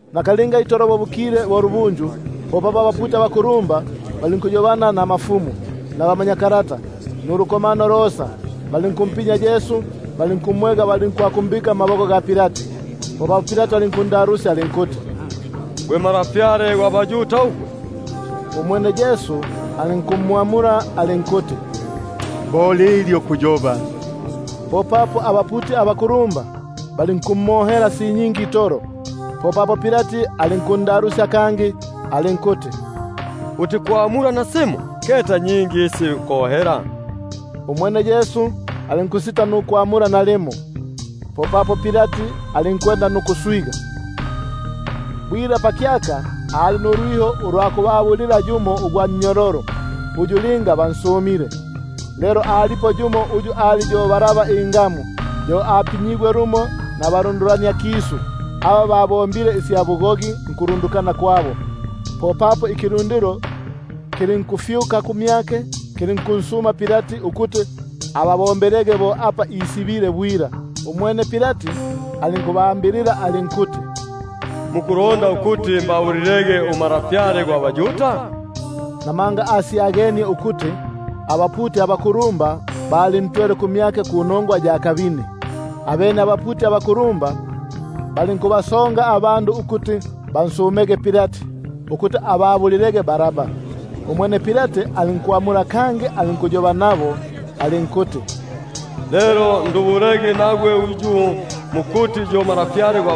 Nakalinga itolo bo bukile nulubunju, popapo abaputi abakulumba balinkuyobana nabakulumba, nabamanyakalata, nulukomano losa; balinkumpinya Yesu, balinkumwega nukumbika mmaboko ga Pilati. Popapo Pilati alinkundalusya alinkuti: Bati, uli Ntwa gwa baYuda ugwe? Umwene alinkwamula alinkuti: Bo lilyo kuyoba. Abaputi abakulumba balinkumohela si nyingi itolo. Popapo Pilati alinkundalusya kangi alinkuti: Utikwamula nasimo? Keta nyingi isi biku- kohela. Umwene Yesu alinkusita nukwamula nalimo, bunobuno Pilati alinkuswiganika. Bwila pakyaka ababulilaga yumo ugwa nnyololo, uyu linga bansumile. Lelo alipo yumo uyu ali yo Baraba ingamu, yo apinyigwe lumo nabalundulaniakisu, aba babombile isya bugogi ukulundukana kwabo. Popapo ikilundilo kilinkufyuka kumyake, kilinkunsuma ukuti ababombelege bo apa isibile bwila. Umwene Pilati alinkubamula alinkuti: Muku- londa ukuti mbabulilege uNtwa gwa baYuda? Namanga asyagenie ukuti abaputi abakulumba balintwele kumyake panongwa ya kabini. Abene abaputi abakulumba balinkukisambulania ikilundilo, ukuti pali panunupo ababulilege Baraba. Umwene Pilati alinkwamula kangi, alinkuyoba nabo alinkuti: Lelo ndubulege nagwe uyu mukuti yo Ntwa gwa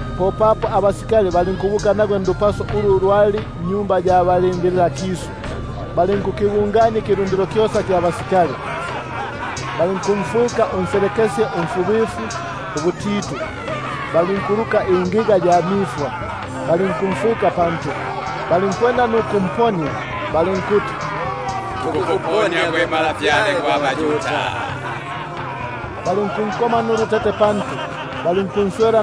Popapo abasikali balinkubuka nagwe ndupaso ulu lwali nnyumba sya bulindililakisu, balinkukibungania ikilundilo kyosa ikya basikali. Balinkumfwika unselekesye umfubifuubutitu, balinkuluka ingiga ya mifwa, balinkumfwika pantu; balinkwanda ukumponia balinkuti: Tukukuponia gwe Ntwa gwa baYuda! Balinkunkoma nulutete pantu, balinkunswela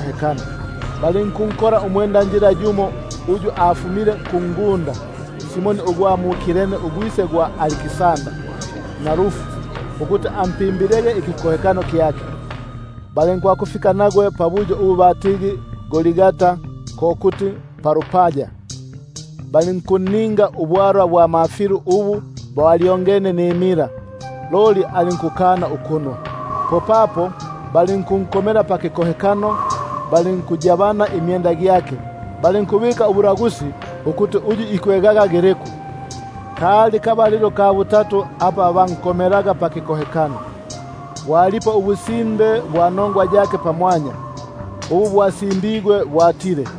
hekano. Balinkunkola umwendanjila yumo uyu afumile kungunda, Simoni ugwa mu-Kireni, ugwise gwa ba-Aliksa- ndara na Rufu, ukuti ampimbile ikikohekano kyake. Balinkwakufika nagwe pabuyo ubu batigi Golgata, ko kuti po palupaya. Balinkunninga ubwalwa bwa mafilu ubu balu- ngilemo mila; loli alinkukana ukunwa. Popapo balinkunkomela pakikohekano balinkuyabania imyenda gyake, bali- nkubika ubulagusi ukuti uyu ikwegaga giliku. Kali kabalilo ka butatu apa bankomelaga pakikohekano. Bwalipo ubusimbe bwa nongwa yake pamwanya, ubu bwasimbigwe ukuti: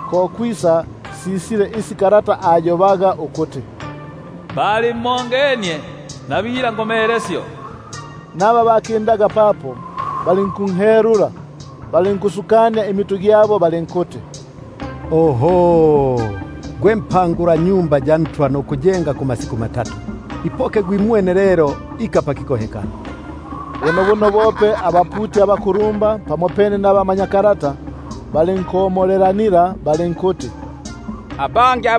Ko kwisa sisile isi kalata ayobaga ukuti: Balimongenie nabila- ngomelesyo. Naba bakindaga papo balinkunhelula nukusukania imitu gyabo balinkuti: Oho! Gwe mpangula-Tempeli nukunjenga kumasiku matatu! Ipoka gwimwene lelo, ika pakikohekano! Bunobuno bope abaputi abakulumba pamopene nabamanyakalata balinkomolelanila balinkuti: Abangi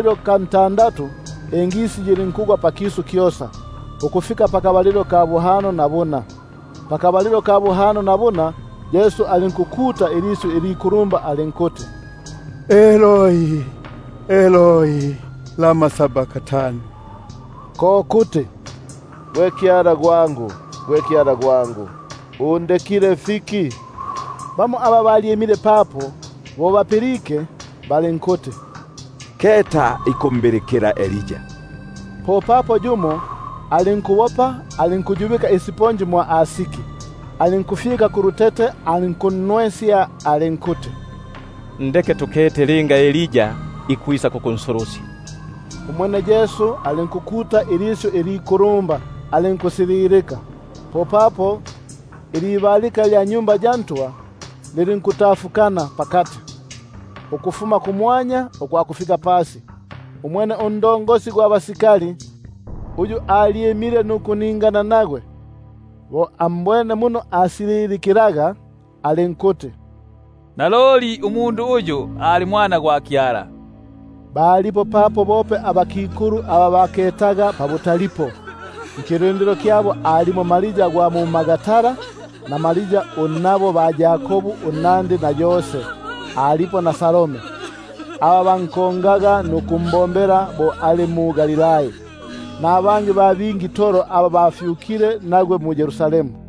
Lelo pakabalilo ka ntandatu yilinkugwa ingisi pakisu kyosa, ukufika nkabalilo ka buhano na buna. Nkabalilo ka buhano na buna, Yesu alinkukuta ilisyu ilikulumba, alinkuti: Eloi, Eloi, Lama Sabaktani? Ko kuti: Gwe Kyala gwangu, Kyala gwangu, undekile fiki? Bamo aba balyimile papo bo bapilike balinkuti: Keta ikumbilikila Elia. Popapo yumo alinkubopa alinkuyubika akenda mwa asiki, alinkufyika kulutete alinkunnwesya, alinkuti: Ndeke tukete linga Elia ikwisa kukunsu- lusya! Umwene Yesu alinkukuta ilisyu ilikulumba, alinku- sililika. Popapo ilibalika lya mwa Tempeli lilinkutafukana pakati, ukufuma kumwanya ukwakufika pasi. Umwene sarjenti, uyu alyimile nukuningana nagwe, bo ambwene muno asililikilaga, alinkuti: Naloli umundu uyu ali Mwana gwa Kyala. Balipo papo bope abakikulu aba baketaga pabutalipo; nkilundilo kyabo alipo Maria gwa mu-Magdala, na Maria unnabo ba-Yakobu unnandi na Yose, alipo na Salome, aba bankongaga nukumbombela bo ali mu-Galilai; nabangi ba bingi itolo aba bafyukile nagwe mu-Yerusalemu.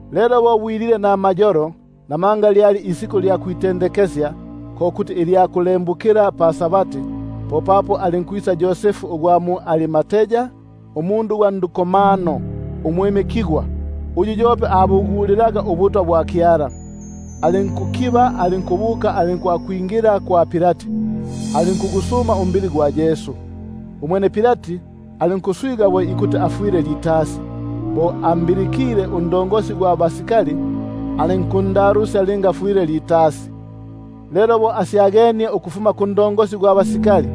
Lelo bo bwilile namayolo, (namanga lyali isiku lya kwitende- kesya, ko kuti ilya kulembukila pa-Sabati), popapo alinkwisa Yosefu ugwa mu-Arimatai, umundu gwa ndukomano umwimikigwa, uyu yope abugulilaga ubutwa bwa Kyala, alinkukiba alinkubuka nukwingila kwa Pilati, alinkugusuma umbili gwa Yesu. Umwene Pilati alinkuswiga ukuti afwile litasi; bo ambilikile sarjenti, alinkundalusya linga afwile litasi. Lelo bo asyagenie ukufuma kwa sarjenti,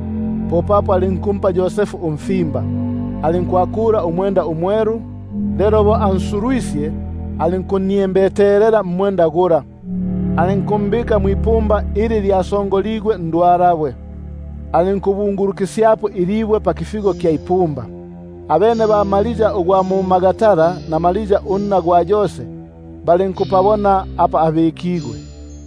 popapo alinkumpa Yosefu umfimba. Alinkwakula umwenda umwelu; lelo bo ansulwisye, alinkunniembetelela mmwenda gula, alinkumbika mwipumba, ili lyasongoligwe ndwalabwe, alinkubungulukisyapo ilibwe pakifigo kya ipumba. Abene ba-Maria ugwa mu-Magdala na Maria unna gwa Yose balinkupabona apa abi-kigwe.